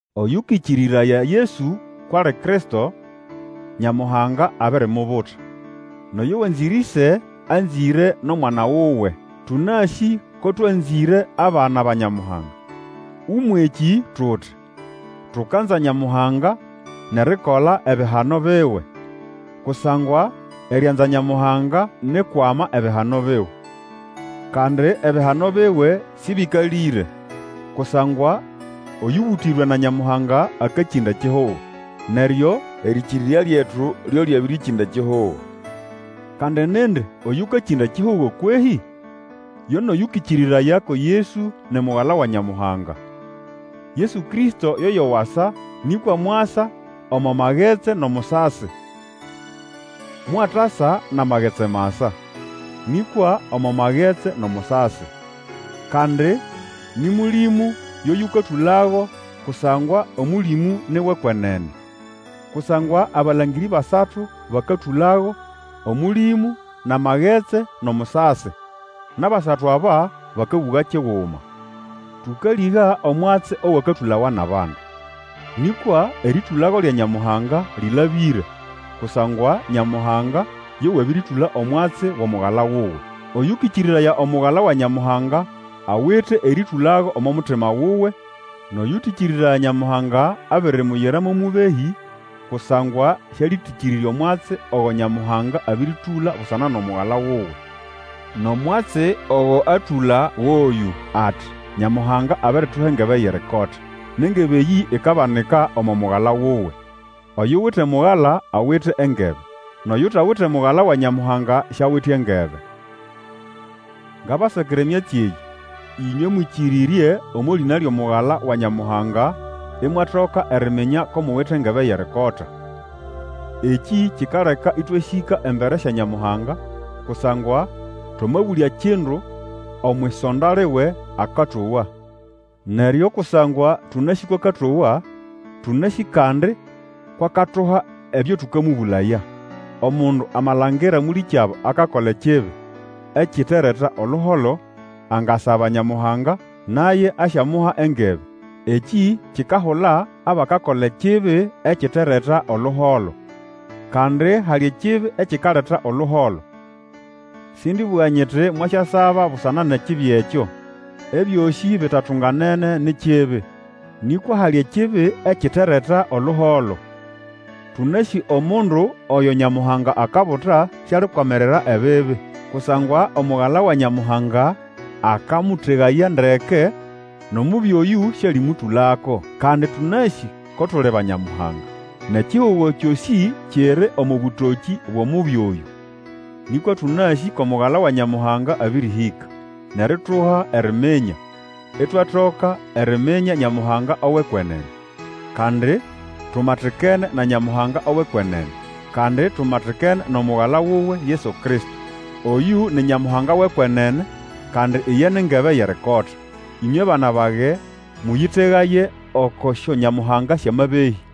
Oyũkĩkĩrĩraya Yesu kwʼali Kristo, Nyamuhanga abirimubuta, nʼoyo wanzĩre ĩse anzĩre nʼomwana wuwe. Tũnasĩ ko twanzĩre abana ba Nyamuhanga, Ũmwʼekĩ tuti, Tukanza Nyamuhanga nʼerikola ebihano biwe. Kusangwa erianza Nyamuhanga ni ʼkwama ebihano biwe, kandi ebihano biwe sĩbĩkalĩre. Kusangwa oyũbũtĩrwe na Nyamuhanga akakĩnda ekihugo. Neryo erĩkĩrĩrya lyetu lyo lyabĩrĩkĩnda ekihugo. Kandi nindi Oyũkakĩnda ekihugo kwehĩ? Yo nʼoyũkĩkĩrĩraya ko Yesu ni Mugala wa Nyamuhanga. Yesu Kristo yoyo wasa: nĩkwa mwasa omo magetsi nʼomusasi. Mwatasa nʼamagetsi masa, nĩkwa omo magetsi nʼomusasi. Kandi nĩ Mũlĩmũ yo yũkatũlago, kusangwa Omũlĩmũ ni wʼekwenene. Kusangwa abalangĩrĩ basatu bakatũlago, Omũlĩmũ, nʼamagetsi, nʼomusasi. Nʼabasatu aba bakabũga kiguma. Tũkalĩga omwatsi owakatũlawa nʼabandu, nĩkwa erĩtũlago lya Nyamuhanga lĩlabĩre, kusangwa Nyamuhanga yo wabĩrĩtũla omwatsi wʼomugala wuwe. Oyũkĩkĩrĩraya Omugala wa Nyamuhanga awite erĩtũlago omo mutima wuwe; nʼoyũtĩkĩrĩraya Nyamuhanga, abirimuyira mo mũbehĩ, kusangwa sĩalĩtĩkĩrĩrya omwatsi ogo Nyamuhanga abĩrĩtũla busana nʼomugala wuwe. Nʼomwatsi ogo atũla goyũ: ati, Nyamuhanga abirituha engebe yʼerikota, nʼengebe eyĩ ikabanika omo Mugala wuwe. Oyuwite Omugala awite engebe, nʼoyutawite Omugala wa Nyamuhanga siawite engebe. Ngabasakira emyatsi eyĩ, ĩnywe mwĩkĩrĩrye omo lĩna lyʼomugala wa Nyamuhanga, imwatoka eriminya ko muwite engebe yʼerikota. Ekĩ kikaleka ĩtwasĩka embere sya Nyamuhanga, kusangwa twamabũlya kindu omwʼisonda liwe, akatowa. Neryo kusangwa tũnasĩ kwʼakatowa, tũnasĩ kandi kwʼakatuha ebyo tũkamũbũlaya. Omundu amalangira mũlĩkyabo akakola ekibi ekitereta oluholo, angasaba Nyamuhanga, naye asyamuha engebe. Eki kikahula abakakola ekibi ekitereta oluholo. Kandi hali ekibi ekikaleta oluholo; sĩndĩbũga nyiti mwasyasaba busana nʼekibi ekyo. Ebyosĩ bitatunganene ni kibi, nikwa hali ekibi ekitereta oluholo. Tũnasĩ omundu oyo Nyamuhanga akabuta, sialikwamirira ebibi. Kusangwa Omugala wa Nyamuhanga akamũtegaya ndeke, nʼomubi Oyũ sĩalimũtũlako. Kandi tũnasĩ ko tuli ba Nyamuhanga, nʼekihugo kyosĩ kiri omo bũtokĩ bwʼOmubi Oyũ. Nĩkwa tũnasĩ kʼomugala wa Nyamuhanga abĩrĩhĩka, nʼerituha eriminya, itwatoka eriminya Nyamuhanga owʼekwenene. Kandi tumatikene na Nyamuhanga owʼekwenene, kandi tumatikene nʼomugala wuwe Yesu Kristo. Oyũ ni Nyamuhanga wʼekwenene, kandi iye ni ngebe yʼerikota. Ĩnywe bana bage, mũyĩtegaye oko syonyamuhanga syʼamabehĩ.